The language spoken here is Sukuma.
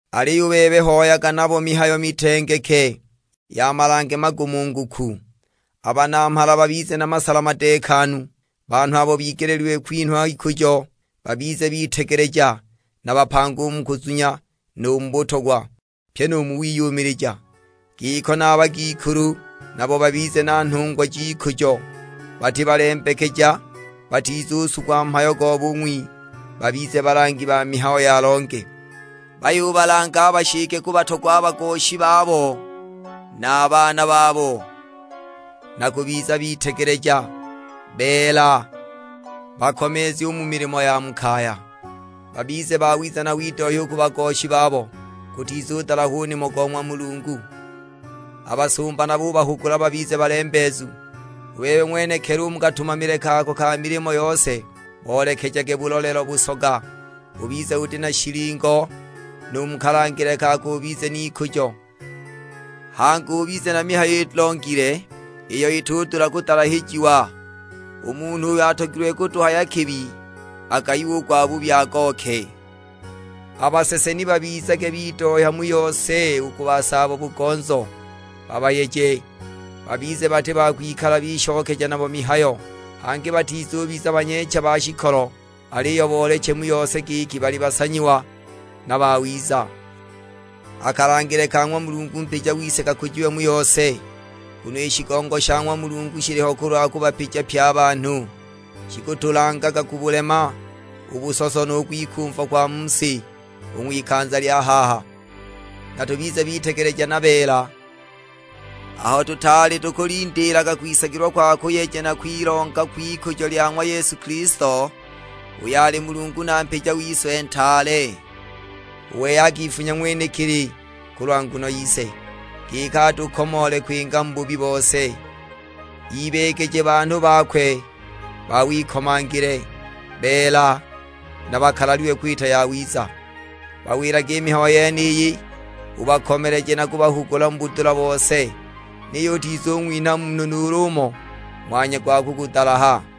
Aliyo u bebe hoyaga nabo mihayo mitengeke, ya malange magumunguku. A banamhala babize na masala madeekanu, banhu abo bigeleelilwe kwinhwa ikujo. Babize bitegeleja na bapanga u mu kuzunya nu mu butogwa, pyi nu mu wiyumilija. Giko na a bagikulu, nabo babize na nhungwa j'ikujo, bati balembekeja, batizusugwa mhayo go bung'wi, babize balangi ba mihayo ya longe. Bayubalanga a bashike kubatogwa a bagoshi babo na a baana babo; na kubiza bitegeleja, beela, bakomeezu u mu milimo ya mu kaya. Babize bawiza na bidohya u ku bagoshi babo, gutizudalahwa u nimo go ng'wa Mulungu. A basumba nabo ubahugula babize balembeezu. U bebe ng'wenekili u mu katumamile kako ka milimo yose boolekejage bulolelo busoga, ubize uti na shilingo, nu mu kalangile kako ubize n'ikujo. Hangi ubize na mihayo ilongile, iyo itudula kudalahijiwa; u munhu uyo atogilwe kutuhaya kibi agayiwe u gwabubi, agooke. A basese ni babizage bidohya mu yose u ku basaabo-bugonzo, babayeje, babize bati ba kwikala bishokeja nabo mihayo. Hangi batizubiza banyeecha ba shikolo, aliyo booleche mu yose giki bali basanyiwa na bawiza, a kalangile ka ng'wa Mulungu mpija wise kakujiwe mu yose. Nguno i shigongo sha ng'wa Mulungu shiliho kulwa kubapija pye a banhu. Shikutulangaga kubulema u busoso nu kwikumva kwa mu si, u ng'wikanza lya haha; na tubize bitegeleja na beela, aho tutaali tukulindiilaga kwisagilwa kwa kuyeja na kwilonga kw'ikujo lya ng'wa Yesu Kilisto, uyo ali Mulungu na mpija wise ntaale. U wei akifunya ng'wenekili kulwa nguno yise, giki atukomoole kwinga mu bubi bose, ibeegeje banhu bakwe ba wikomangile, beela, na bakalalilwe kwita yawiza. Bawilage i mihayo yeniyi, ubakomeleje na kubahugula mu budula bose. Niyo utizung'winha munhu nuulu umo ng'wanya gwa kukudalaha.